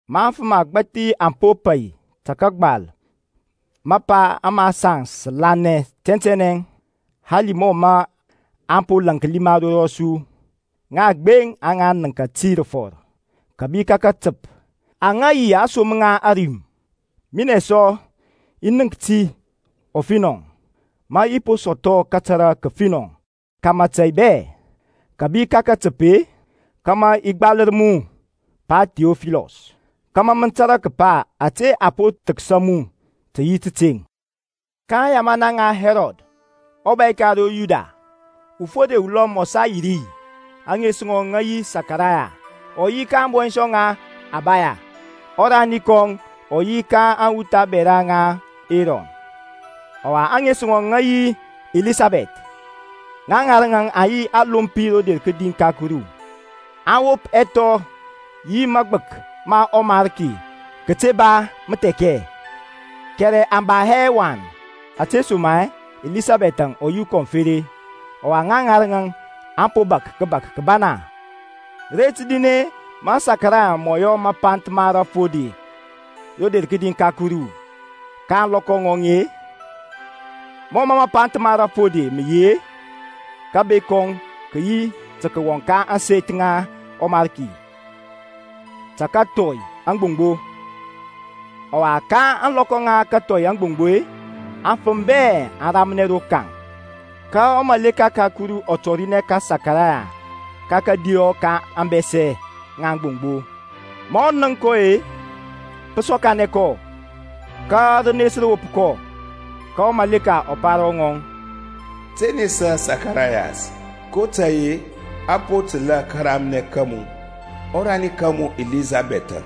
Ma afəm agbȧthi aŋ po pai tə kəgbal mapa ama saŋ sə lanɛ tɛntɛnɛ, hali mɔ mə aŋ po laŋklia ma ro rɔsu, ŋaŋ gbeŋ aŋa nəŋka ti rəfɔr kȧbi ka katəp aŋa yi aŋsom ŋa ȧrim. Minɛ sɔ i nənk ti ɔfinɔ, ma i po sɔthɔ kətara kəfinɔ ka mȧtȧy bɛ kȧbi ka katəp-e, kȧmȧ i gbalər mu Pa Thiɔfilɔs kȧmȧ mə tȧrȧ kəpa ȧte a po thəksa mu tə yi tȧteŋ. Ka aŋyamana ŋa Hɛrɔd ɔbȧy ka ro Yudia, ufode ulɔm ɔ sa yi ri, ȧŋes ŋɔŋ ŋə yi Sakarayas, ɔ yi ka ȧŋbɔnshɔŋ ŋa Abaya, ɔrani kɔŋ ɔ yi ka aŋwuth abɛra ŋa Erɔn, ɔwa ȧŋes ŋɔŋ ŋə yi Elisabɛth. Ŋa ŋarəŋ aŋ yi alompi rodi ka Kuru, aŋ wop ɛthɔ yi magbək ma ɔMarki kəte ba məthɛkɛ. Kɛrɛ aŋ ba hɛ wan ȧtesoma-e Elisabɛth-əŋ ɔ yi ukɔŋfere, ɔwa ŋa ŋarəŋȧŋ aŋ po bȧk kəbak kəbana. Ret rin-e mɔ Sakarayas mɔ yɔ mapanth ma rafode rodi ka Kuru ka ȧŋlɔkɔ ŋɔŋ-e, mɔ mapanth ma rafode mə yi-e, kȧber kɔŋ kə yi tə kəwɔŋ ka ȧŋseth ŋa ɔMarki tə kəthɔi aŋgboŋgbo. Ɔwa ka ȧŋlɔkɔ ŋa kathɔi aŋgboŋgbo-e, aŋfəm bɛ aŋ ramnɛ rokaŋ. Ka wurɔ ka Kuru ɔ tɔrinɛ ka Sakarayas ka kȧdiyɔ ka ȧŋbɛsɛ ŋa aŋgboŋgbo. Ma ɔ nənk kɔ-e, pɔ sɔkanɛ kɔ, ka rənes rə wop kɔ. Ka ɔmaleka ɔ pa ro ŋɔŋ, Te nesa Sakarayas, kotȧy-e a po təlȧ karamnɛ ka mu. Ɔrani ka mu Elisabɛth-əŋ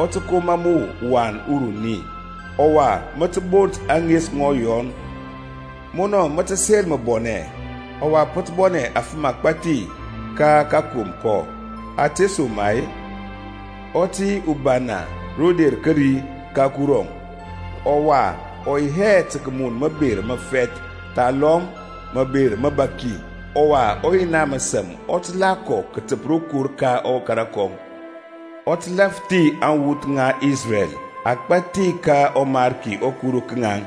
ɔ tə koma mu wan uruni, ɔwa mə tə bont ȧŋes ŋɔŋ Yɔn. Munɔ mə tə sel məbɔnɛ; ɔwa pə tə bɔnɛ afəm agbȧthi ka kakom kɔŋ. Ȧtesoma-e ɔ tə yi ubana roder kəri ka Kurɔŋ, ɔwa ɔ yi hɛ tə kəmun məber məfɛth thalɔm məber məbaki. Ɔwa ɔYina məsəm ɔ tə la kɔ kətəp rokor ka ɔkara kɔŋ. Ɔ tə lȧfthi aŋwuth ŋa Isrɛl agbȧthi ka ɔMarki ɔKuru ka ŋaŋ.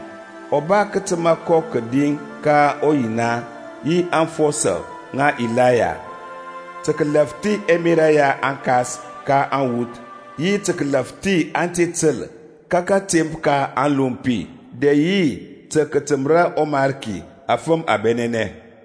Ɔ ba kətəma kɔ kədi ka ɔYina yi aŋfɔsɔ ŋa Ilaya, tə kəlafthi ɛmerȧ ya aŋkas ka aŋwuth, yi tə kəlafthi ante təl ka kȧtemp ka aŋlompi, dɛ yi tə kətəməra ɔMarki afəm abɛnɛnɛ.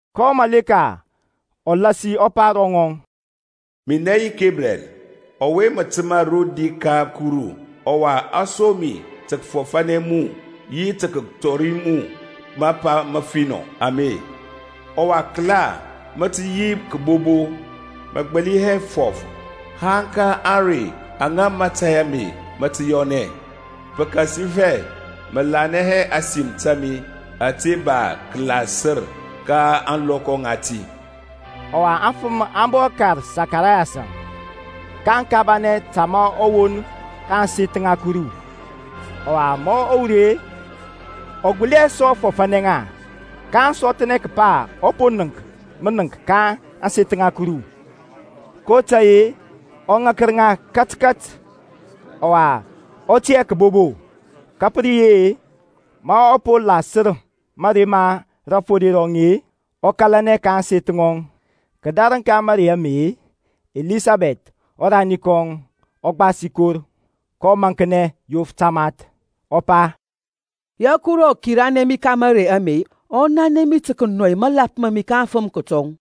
Ka ɔmaleka ɔ lasi ɔ pa ro ŋɔŋ, Minɛ yi Kebriɛl, ɔwe mə təmȧ rodi ka Kuru; ɔwa a som mi tə kəfɔfanɛ mu yi tə kətɔri mu mapa məfinɔ ame. Ɔwa kəla, mə tə yi kəbobo, mə gbəli hɛ fɔf haŋ ka ȧŋrey aŋa mȧtȧy ame mə tə yɔnɛ, pəkasifɛ mə lanɛ hɛ ȧsim ta mi ȧte ba kəlasər ka ȧŋlɔkɔ ŋati. Ɔwa aŋfəm aŋ bɔ kar Sakarayas-əŋ, kaŋ kabanɛ ta ma ɔ won ka ȧŋseth ŋa Kuru. Ɔwa ma ɔ wur-e, ɔ gbəli hɛ sɔ fɔfȧnɛ ŋa. Ka aŋ sɔthnɛ kəpa ɔ po nənk mənəŋk ka ȧŋseth ŋa Kuru, kotȧy-e ɔ ŋakər ŋa katkat, ɔwa ɔ tiyȧ kəbobo. Ka pə re yi-e, ma ɔ po lasər mȧrey ma rafode rɔŋ-e, ɔ kȧlanɛ ka ȧŋseth ŋɔŋ. Kədarəŋ ka mȧrey ame-e, Elisabɛth ɔrani kɔŋ ɔ gbasi kor, kɔ maŋknɛ yof tamath, ɔ pa, Ya Kuru ɔ kiranɛ mi ka mȧrey ama ɔ nanɛ mi tə kənɔi mȧlap ma mi ka aŋfəm kətɔŋ.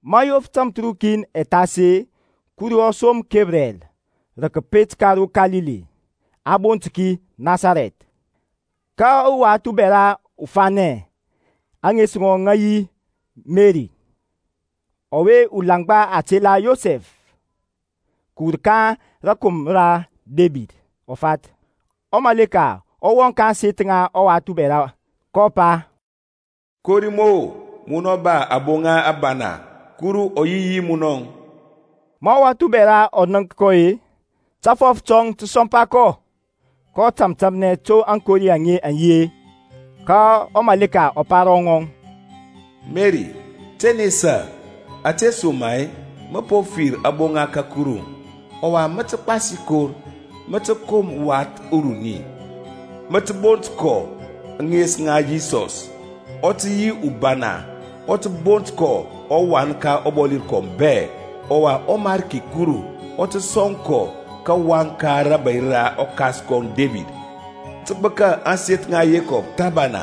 Ma yof tamthərukin ɛ thas-e, Kuru ɔ som Kebriɛl rə kəpet ka ro Kalili, a bont ki Nasarɛth, ka uwath ubɛra ufanɛ, ȧŋes ŋɔŋ ŋə yi Merɛŋ, ɔwe ulaŋgba, a tela Yosɛf, kəwur ka rȧkomra ra Debid, ɔ fath. Ɔmaleka ɔ wɔŋ ka ȧŋseth ŋa ɔwath ubɛra, kɔ pa, Kori mu-o, mun ba aboŋa abana, Kuru ɔ yi yi munɔŋ. Ma ɔwath ubɛra ɔ nənk kɔ-e, tafɔf tɔŋ tə sɔmpa kɔ, kɔ tȧmtȧmnɛ to aŋkori aŋe aŋ yi-e. Ka ɔmaleka ɔ pa ro ŋɔŋ, Meri, te nesa, ȧtesoma-e mə po fir aboŋa ka Kuru. Ɔwa mə tə gbasi kor, mə tə kom wath uruni, mə tə bont kɔ ŋes Yisɔs. Ɔ tə yi ubana, a tə bont kɔ ɔWan ka ɔBɔli rəkɔm bɛ; ɔwa ɔMarki Kuru ɔ tə sɔŋ kɔ kawaŋ ka rȧbȧy ra ɔkas kɔŋ Debid. Ɔ tə gbəka ȧŋseth ŋa Yekɔb thəbana.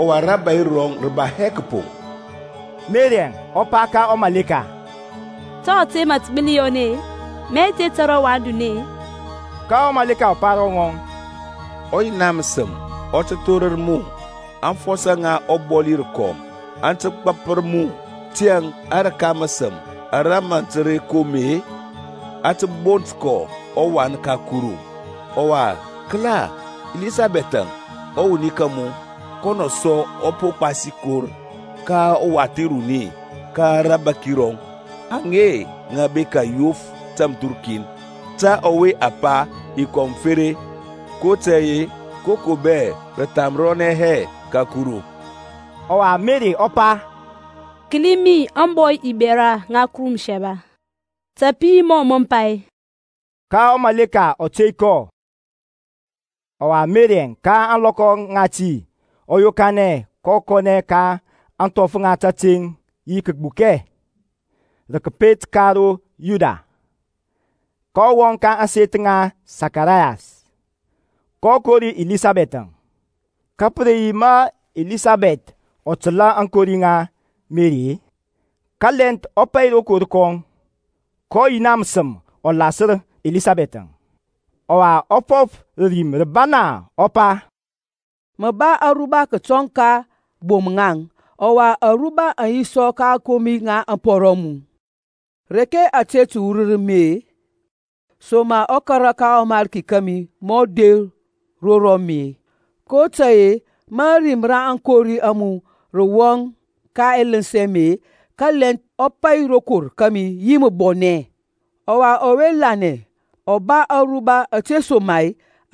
Ɔwa rȧbȧy rɔŋ rə ba hɛ kəpoŋ. Merɛŋ ɔ pa ka ɔmaleka, To ȧte mə tə gbəli yɔnɛ-e ma i te tȧrȧ wan duni-e? Ka ɔmaleka ɔ pa ro ŋɔŋ, ɔYina məsəm ɔ tə thorər mu, aŋfɔsɔ ŋa ɔBɔli rəkɔm aŋ tə gbəpər mu. Tiyȧŋ arəka rəsəm ara mə tə re kom-e, a tə bont kɔ, ɔWan ka Kuru. Ɔwa kəla, Elisabɛth-əŋ, ɔwuni ka mu, kɔnɔ sɔ ɔ po gbasi kor ka wath uruni ka rabȧki rɔŋ; aŋe ŋə bekȧ ɛyof tȧmthərukin ta ɔwe a pa, ukɔnfere. kotȧy-e, koko bɛ rə thamrɔnɛ hɛ ka Kuru. Ɔwa Meri ɔ pa, Kəli mi ȧŋbɔy ubɛra ŋa Kuru Məsaba, ta pə yi mɔ pa-e. Ka ɔmaleka ɔ tey kɔ. Ɔwa Merɛŋ ka ȧŋlɔkɔ ŋati ɔ yokanɛ, kɔ kɔnɛ ka ȧŋthɔf ŋa tȧteŋ yi kəgbukɛŋ, rə kəpet ka ro Yuda. kɔ wɔŋ ka ȧŋset ŋa Sakarayas, kɔ kori Elisabɛth-əŋ. Ka pə re yi ma Elisabɛth ɔ təlȧ aŋkori ŋa Meri-e, kalɛnth ɔ pai rokor kɔŋ, ka ɔYina məsəm ɔ lasər Elisabɛth-əŋ, ɔwa ɔ fɔf rə rim rəbana, ɔ pa, Mə ba aruba kətɔŋ ka bom-ŋaŋ, ɔwa aruba aŋ yi sə ka ȧŋkomi ŋa ȧŋpɔru a mu. Reke ȧte tə wurər mi-e, soma ɔkara ka ɔMarki kȧmi mɔ der ro rɔmi-e? kotȧy-e ma ȧrim ra aŋkori a mu rə wɔŋ ka ɛləns ɛ mi-e, kalɛnth ɔ pai rokor kȧmi yi məbɔnɛ. Ɔwa ɔwe lanɛ ɔ ba aruba, ȧtesoma-e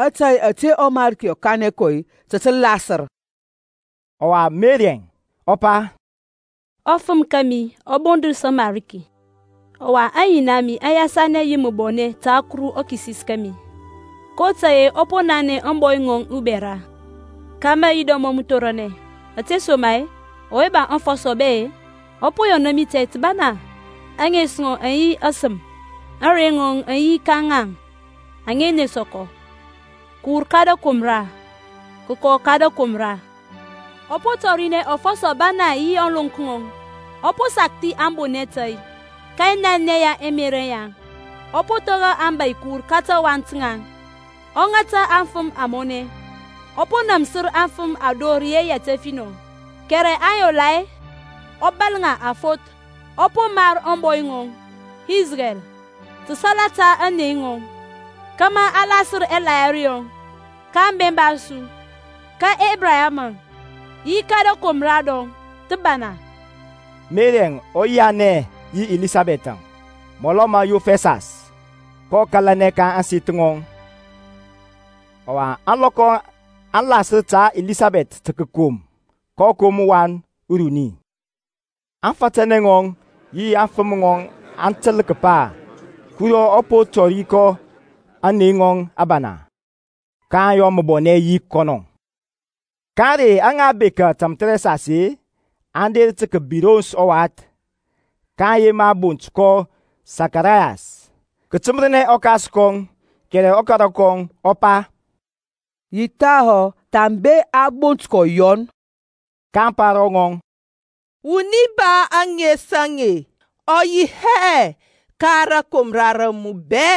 ȧtȧy ȧte ɔMarki ɔ kanɛ kɔ tə tə lasər. Ɔwa Merɛŋ ɔ pa, Ɔfəm ɔka mi ɔ bondəs ɔMarki, Ɔwa aŋyina a mi aŋ yasanɛ yi məbɔnɛ ta Kuru ɔKisis kȧmi, kotȧy-e ɔ po nanɛ ȧŋbɔy ŋɔŋ ubɛra ka mayira mɔŋ məthoranɛ. Ȧtesoma-e ɔwe ba aŋfɔsɔ bɛ-e ɔ po yɔna mi tȧy təbana; Aŋes ŋɔŋ aŋ yi ɔSəm. Aŋney ŋɔŋ aŋ yi ka ŋaŋ aŋa nesa kɔ, Kəwur ka rəkomra kəkɔ ka rəkomra. Ɔ po tɔrinɛ afɔsɔ abana yi ȧŋlonk ŋɔŋ. Ɔ po sakthi aŋbonɛ tȧy ka ɛnanɛ ya ɛmerȧ yaŋ. Ɔ po thora abȧy kəwur ka tawaŋ taŋ; Ɔ ŋata aŋfəm amɔnɛ. Ɔ po namsir aŋfəm ador yi yɛt ɛfinɔ, Kɛrɛ aŋyola-e, ɔ bȧl ŋa afoth. Ɔ po mar ȧŋbɔy ŋɔŋ Isrɛl salata aŋnei ŋɔŋ, Kama ɔ lasər ɛlahiri yɔŋ ka aŋbemba a su, Ka Ebraham, yi ka rȧkomra rɔŋ thəbana. Merɛŋ ɔ yianɛ yi Elisabɛth-ȧŋ mɔlɔ ma yof ɛsas, kɔ kȧlanɛ ka ȧŋseth ŋɔŋ. Ɔwa ȧŋlɔkɔ aŋ lasər ta Elisabɛth tə kəkom, kɔ kom wath uruni. Aŋfatanɛ ŋɔŋ yi aŋfəm ŋɔŋ aŋ təl kəpa Kurɔŋ ɔ po tɔri kɔ aŋnei ŋɔŋ abana, kaŋ yɔ məbɔnɛ yi kɔnɔŋ. Ka ȧŋrey aŋa bekȧ tamthərɛsas-e, aŋ der tə kəbirons ɔwath, kaŋ yema bont kɔ Sakarayas, kətəmərnɛ ɔkas kɔŋ. Kɛrɛ ɔkara kɔŋ ɔ pa, Yi thahɔ, thambe a bont kɔ Yɔn. kaŋ pa ro ŋɔŋ, Wuni ba ȧŋes aŋe ɔ yi hɛ ka rȧkomra ra mu bɛ.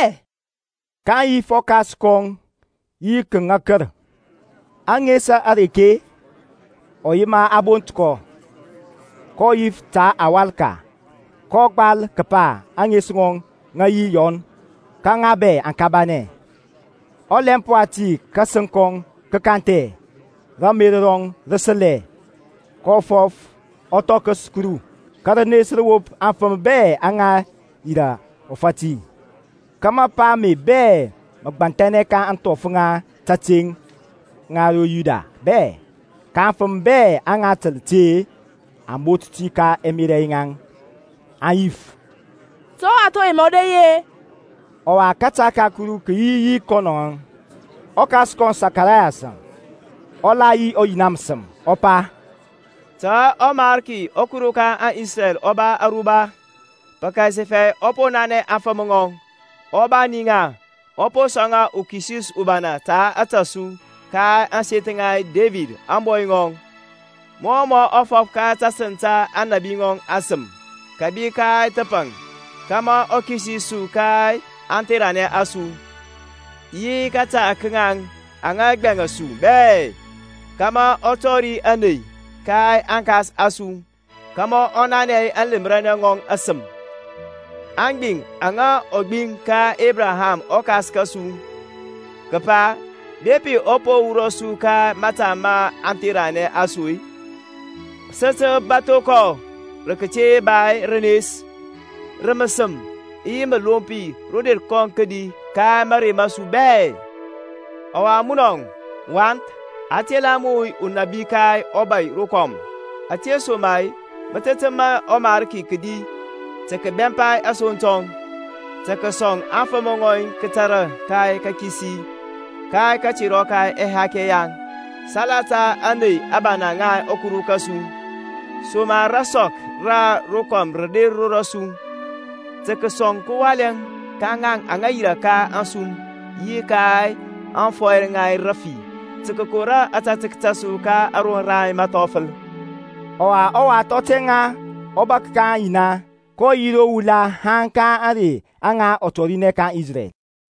kaŋ yif ɔkas kɔŋ yi kəŋakər, ȧŋes areke ɔ yema a bont kɔ. kɔ yif ta awalka, kɔ gbal kəpa, Aŋes ŋɔŋ ŋə yi Yɔn. Ka ŋa bɛ aŋ kabanɛ. Ɔlɛmp wati kȧsəŋ kɔŋ kə kanthɛ, ramer rɔŋ rə səlɛ, kɔ fɔf, ɔ thɔkəs Kurɔŋ. Ka rənes rə wop aŋfəm bɛ aŋa yirȧ ɔfati; ka mapa ame bɛ mə gbanthɛnɛ ka ȧŋthɔf ŋa tȧteŋ ŋa ro Yudia bɛ. Ka aŋfəm bɛ aŋa təl ti-e, aŋ bot ti ka ɛmerȧ yaŋ, aŋ yif. To ɔwath ɔwe mɔ re yi-e? Ɔwa kȧta ka Kuru kə yi yi kɔnɔŋȧŋ. Ɔkas kɔŋ Sakarayaŋ ɔ la yi ɔYina məsəm, ɔ pa, Ta ɔMarki ɔKuru ka Isrɛl ɔ ba aruba, Pəkasifɛ ɔ po nanɛ afəm ŋɔŋ, ɔ bani ŋa. Ɔ po sɔŋ uKisis ubana ta ȧtȧ su Ka ȧŋseth ŋa Debid ȧŋbɔy ŋɔŋ. Mɔ mɔ fɔf ka tasəŋ ta aŋnabi ŋɔŋ asəm, kȧbi ka thəpaŋ. Kama ɔ kisis su ka aŋtheranɛ a su, Yi ka kȧta ka ŋaŋ aŋa gbɛŋa su bɛ. Kama ɔ tɔri ȧney ka aŋkas a su, Kama ɔ nanɛ aŋlemranɛ ŋɔŋ asəm. Aŋgbiŋ aŋa ɔ gbiŋ ka Ebraham ɔkas kȧsu, kəpa, Bepi ɔ po wurɔ su ka mȧta ma aŋtheranɛ a su-e, Sə tə bȧtho kɔ rə kəte ba rənes, Rə məsəm yi məlompi roder kɔŋ kədi ka mȧrey ma su bɛ. Ɔwa munɔŋ, wath, a tə tela mu unabi ka ɔBɔli rəkɔm, Ȧtesoma-e mə tə təmȧ ɔMarki kədi tə kəbɛmpa asoŋ tɔŋ; Tə kəsɔŋ aŋfəm ŋɔŋ kȧtȧrȧ ka kəkisi, Ka katerɔ ka ɛhakɛ yaŋ; Salata ȧŋney abana ŋa ɔKuru kȧsu, Soma rasɔk ra rokɔm rə der ro rɔsu. Tə kəsɔŋ kəwalɛ ka ŋaŋ aŋa yirȧ ka ȧŋsum yi ka aŋfɔyr ŋa rəfi, Tə kəkora ȧtȧtək ta su ka aroŋ ra məthɔfəl. Ɔwa ɔwath ɔ tɛŋa, ɔ bȧk ka aŋyina, kɔ yi ro wula haŋ ka ȧŋrey aŋa ɔ tɔrinɛ ka Isrɛl.